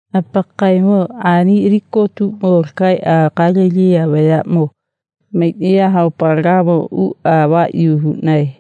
Apakaemo ani kotuʼmo lakaeʼa Gatalini vayaʼmo maiʼnaya haopalegamo uʼa avaʼyi huʼnae.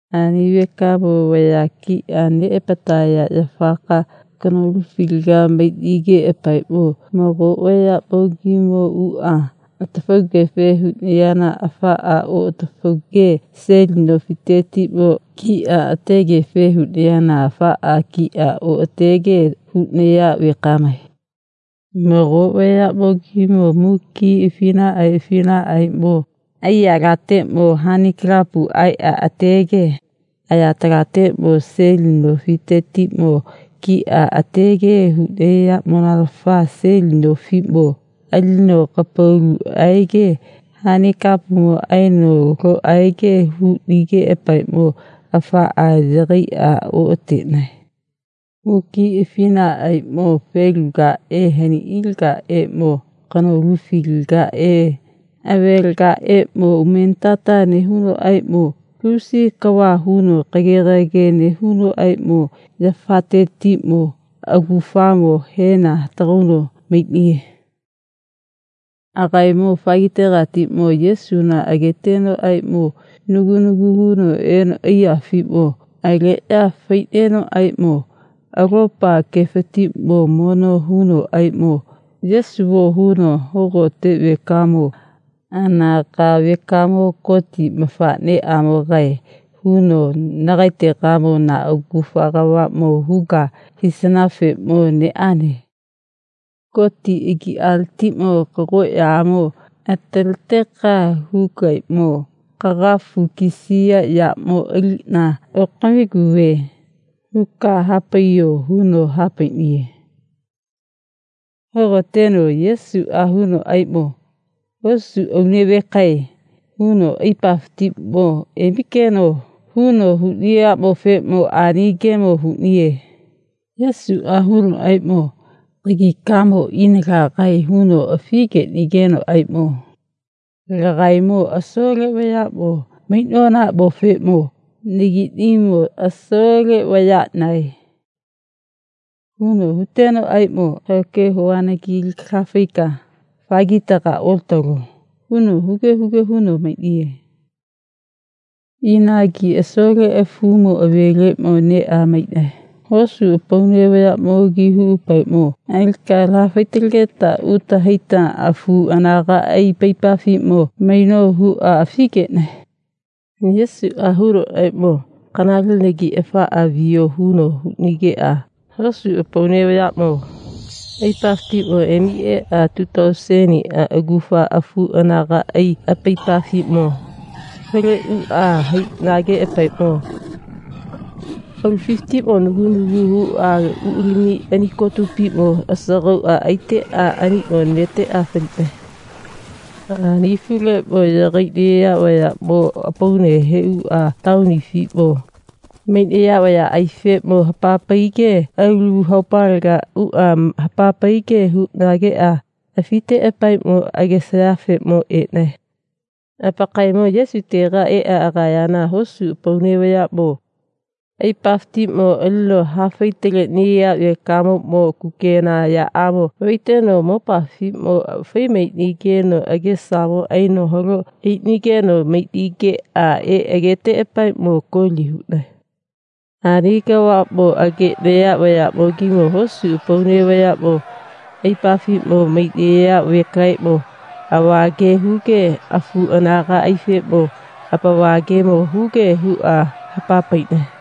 Ani vekamo vaya kiʼa neʼapataya yafaka kanolufilaga maiʼnigeʼapaeʼmo mago vayaʼmogimo uʼa atafaugefe huʼnayana afaʼa oʼatafauge seli nofitetiʼmo kiʼa ategefe huʼnayana afaʼa kiʼa oʼatege huʼnaya vekamae. Mago vayaʼmogimo muki afinaʼae afinaʼaeʼmo aiyalateʼmo hanikapu aiʼa atege ayatalateʼmo seli nofitetiʼmo kiʼa atege huʼnayaʼmonanafa seli nofiʼmo alino kapalu aege hanikapumo aino lo aege huʼnigeʼapaeʼmo afaʼa yagaiʼa oʼateʼnae. Muki afinaʼmo felugaʼe haniʼilagaʼeʼmo kanolufilagaʼe avelegaʼeʼmo umenitata nehunoʼaeʼmo lusi kava huno kage gage nehunoʼaeʼmo yafatetiʼmo agufamo heno hatagauno maiʼniye. Agaemo afagitegatiʼmo Yesuna agetenoʼaeʼmo nagu nagu huno eno aiyafiʼmo aleʼya faiʼnenoʼaeʼmo alopa gefatiʼmo mono hunoʼaeʼmo, Yesuo, huno, Hogote vekamo anaga vekamo Goti mafaʼneʼamogae, huno, nagaetegamo na agufa kavaʼmo huka hisanafeʼmo neʼane. Goti agiʼaletiʼmo kagoʼyamo ataleteka hukaeʼmo, kagafu kisiya yaʼmo aliʼna okamiguve, huka naha paiyo, huno ha paiʼniye. Hogoteno Yesuʼa hunoʼaeʼmo, hosu aune vekae, huno, aipafatiʼmo emikeno, huno huʼniyaʼmofeʼmo ani gemo huʼniye. Yesuʼa hunoʼaeʼmo, kagikamo ina lagae, huno afi geʼnigenoʼaeʼmo lagaemo asole vayaʼmo maiʼnonaʼmofeʼmo nagiʼnimo asole vayaʼnae, huno hutenoʼaeʼmo, kahao ke hovanagi alika laha faika afagitega olatalo, huno huge huge huno maiʼniye. Inagi asole afumo aveleʼmo neʼa maiʼnae. Hosu apaune vayaʼmogi huʼapaeʼmo, alika laha faitalegeta uta haita afu anagaʼai apaipafiʼmo maino, huʼa afigeʼnae. Yesuʼa hunoʼaeʼmo, kanalenagi afaʼa viyo, huno huʼnigeʼa hosu apaune vayaʼmo aipafatiʼmo emi eʼa tu tauseniʼa agufa afu anagaʼai apaipafiʼmo faleʼuʼa haiʼnageʼapaeʼmo aulafifatiʼmo nagu nagu huʼa uʼa lamiʼa ani kotupiʼmo asagauʼa aiteʼa aniʼmo neteʼa faliʼnae. Ani afuleʼmo yagaiʼnaya vayaʼmo apaune heʼuʼa taonifiʼmo maiʼnaya vayaʼaifeʼmo hapa paige alu haopalega uʼa hapa paige huʼnageʼa afiteʼapaeʼmo agesayafeʼmo eʼnae. Apakaemo Yesutega eʼa agayana hosu apaune vayaʼmo aipafatiʼmo alino hapafaitaleʼniya vekamoʼmo kukena yaʼmo vaiteno mopafiʼmo fai maiʼnigeno agesamo aino halo aiʼnigeno maiʼnigeʼa eʼa ageteʼapaeʼmo koli huʼnae. Ani kavaʼmo ageʼnaya vayaʼmogimo hosu apaune vayaʼmo aipafiʼmo maiʼnaya vekaeʼmo ava ge huge afu anagaʼaifeʼmo apava gemo huge huʼa hapa paiʼnae.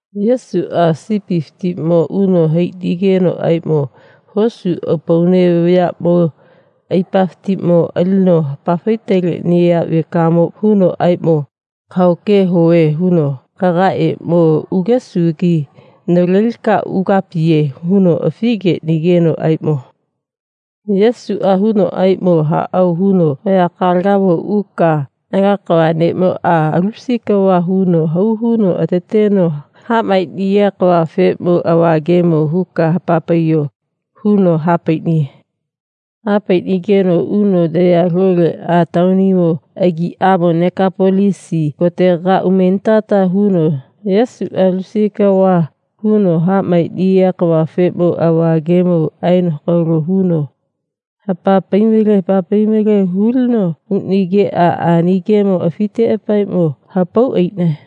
Yesuʼa sipifiʼmo uno haiʼnigenoʼaeʼmo hosu apaune vayaʼmo aipafatiʼmo alino hapafaitaleʼniya vekamoʼmo hunoʼaeʼmo, kahao ke hove, huno, kagaeʼeʼmo ugesugi navalelika ugapiye, huno afi geʼnigenoʼaeʼmo Yesuʼa hunoʼaeʼmo, haʼao, huno, vayakalegamo uka Ala kava neʼmoʼa lusi kava huno hau huno kateteno kaha maeʼniya kavafeʼmo ava gemo huka hapa paiyo, huno ha paiʼniye. Ha paiʼnigeno uno naya loleʼa taonimo agiʼamo Nekapolisi kotegamo umenitata huno Yesuʼa lusi kava huno ha maeʼniya kavafeʼmo ava gemo aeno hakalo huno hapa pai male hapa pai male hulino uʼnigeʼa ani gemo afiteʼapaeʼmo hapau aiʼnae.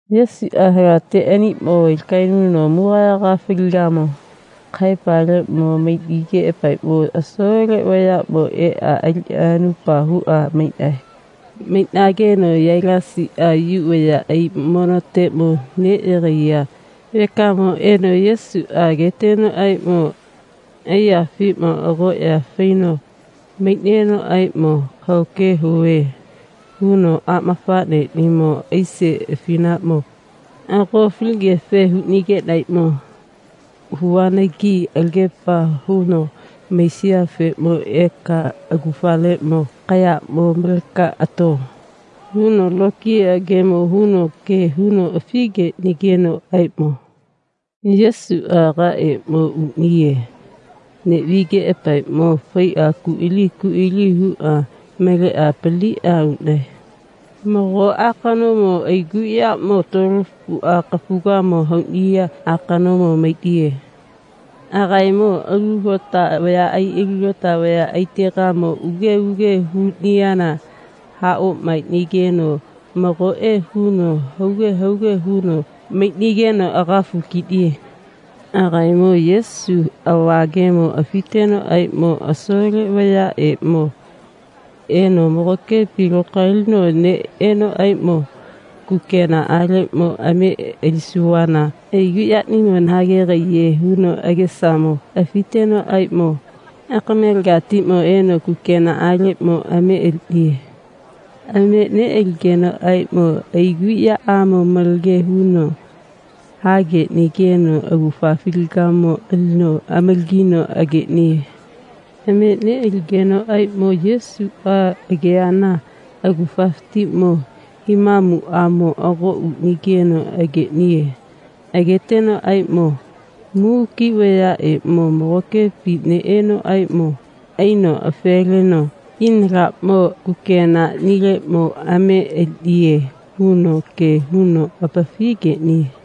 Yesuʼa halate aniʼmo lakaenuno mugagayaga faligamo kahaepaleʼmo maiʼnigeʼapaeʼmo asole vayaʼmo eʼa aliʼa anupa huʼa maiʼnae. Maiʼnageno Yailasiʼa Yu vayaʼai monoteʼmo neʼyagaiya vekamo eno Yesuʼa agetenoʼaeʼmo aiyafiʼmo agoʼya faino maiʼnenoʼaeʼmo, kahao ke hove, huno, aʼmafaʼneʼnimo aise afinaʼmo ago faligefe huʼnigeʼnaeʼmo huvanagi alagepa huno maisiyafeʼmo eka agufaleʼmo kayaʼmo maleka ato, huno lokiya gemo huno ge huno afigeʼnigenoʼaeʼmo Yesuʼa agaeʼeʼmo uʼniye. Neʼvigeʼapaeʼmo faiʼa ku aili ku aili huʼa maleʼa apaliniʼa uʼnae. Mago akanomo aiguyaʼmo tuolofuʼa kafugamo hauʼniya akanomo maiʼniye. Agaemo alu lota vaya alu lota vayaʼaitegamo uge uge huʼniyana ha oʼmaeʼnageno magoʼe huno hauge hauge huno maiʼnigeno agafu kiʼniye. Agaemo Yesufe ava gemo afitenoʼaeʼmo asole vayaʼeʼmo eno magokepi lokaelino neʼenoʼaeʼmo, kukenaʼaleʼmo ame alisuvana aiguʼyaʼnimo nahagegaiye, huno agesamo afitenoʼaeʼmo akamelegatiʼmo eno kukenaʼaleʼmo ame aliʼniye. Ame neʼaligenoʼaeʼmo aiguʼyaʼamo malage huno hageʼnigeno agufafilagamo alino amalagino ageʼniye. Ame neʼaligenoʼaeʼmo Yesuʼa ageyana agufafatiʼmo himamuʼamo ago uʼnigeno ageʼniye. Agetenoʼaeʼmo muki vayaʼeʼmo magokepi neʼenoʼaeʼmo aino afe leno, ina laʼmo kukenaʼnileʼmo ame aliʼniye, huno ge huno apafi geʼniye.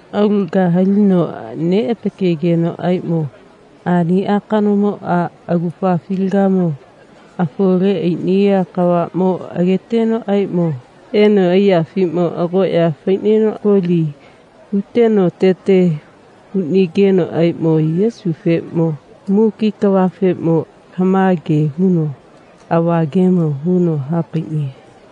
Aulaga halino neʼapakegenoʼaeʼmo ani akanomoʼa agufafilagamo afole aiʼniya kavaʼmo agetenoʼaeʼmo eno aiyafiʼmo agoʼya faiʼneno koli huteno atete hauʼnigenoʼaeʼmo Yesufeʼmo muki kavafeʼmo lama ge huno ava gemo huno ha paiʼniye.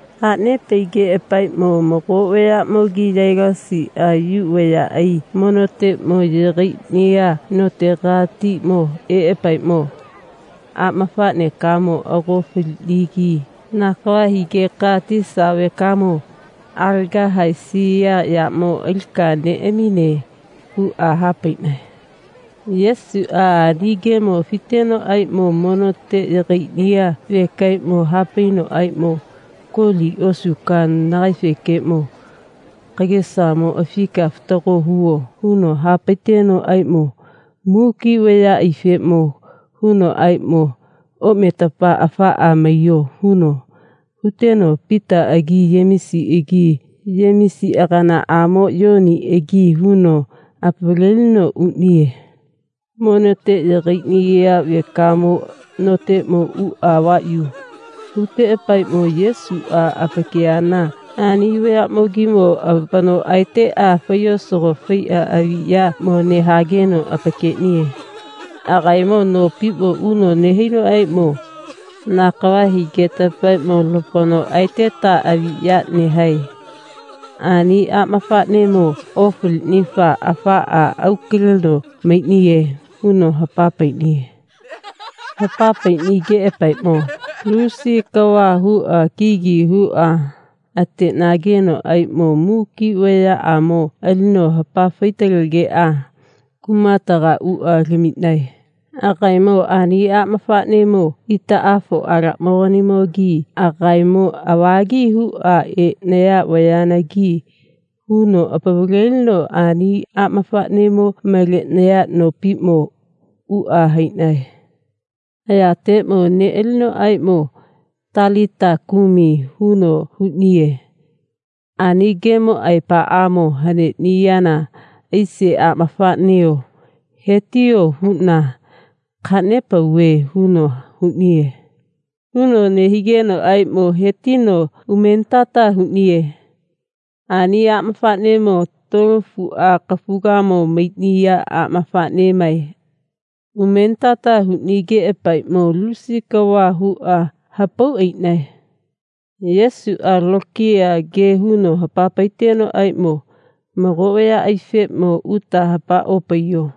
Ha nepaigeʼapaeʼmo mago vayaʼmo Yailasiʼa Yu vayaʼai monoteʼmo yagaiʼniya notegatiʼmo eʼapaeʼmo, aʼmafaʼnekamo ago faliʼnigi na kava higeka tisa vekamo alaga haesiya yaʼmo alika neʼamine, huʼa ha paiʼnae. Yesuʼa ani gemo afitenoʼaeʼmo monote yagaiʼniya vekaeʼmo ha painoʼaeʼmo, koli osuka nagaefekeʼmo kagesamo afika fatago huvo, huno ha paitenoʼaeʼmo muki vayaʼaifeʼmo hunoʼaeʼmo, oʼmetapa afaʼa maiyo, huno huteno Pitaʼagi Yemisiʼagi Yemisi aganaʼamo Yoniʼagi huno apavalelino uʼniye. Monote yagaiʼniya vekamo noteʼmo uʼa avaʼyi huteʼapaeʼmo Yesuʼa apakeyana ani vayaʼmogimo apano aeteʼa faiyosago faiʼa aviʼyaʼmo nehageno apakeʼniye. Agaemo nopiʼmo uno nehainoʼaeʼmo, na kava higetapaeʼmo lapano aeteta aviʼya nehae. Ani aʼmafaʼnemo ofaliʼnifa afaʼa au kaleno maiʼniye, huno hapa paiʼniye. Hapa paiʼnigeʼapaeʼmo lusi kava huʼa kigi huʼa ateʼnagenoʼaeʼmo muki vayaʼamo alino hapa faitalegeʼa kumatega uʼa lamiʼnae. Agaemo ani aʼmafaʼnemo itaʼafoʼalaʼmoganimogi agaemo avagi huʼa eʼnaya vayanagi huno apavalelino ani aʼmafaʼnemo maleʼnaya nopiʼmo uʼa haiʼnae. Ayateʼmo neʼalinoʼaeʼmo, talita kumi, huno huʼniye. Ani gemo aepaʼamo haneʼniyana aise aʼmafaʼneo he tiyo, huʼna kaha nepauve, huno huʼniye. Huno nehigenoʼaeʼmo he tino umenitata huʼniye. Ani aʼmafaʼnemo tuolofuʼa kafugamo maiʼniya aʼmafaʼneʼmae. Umenitata huʼnigeʼapaeʼmo lusi kava huʼa hapau aiʼnae. Yesuʼa lokiya ge huno hapa paitenoʼaeʼmo, mago vayaʼaifeʼmo uta hapa opaiyo,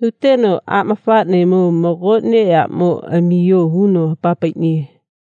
huteno, aʼmafaʼnemo mago neʼyaʼmo amiyo, huno hapa paiʼniye.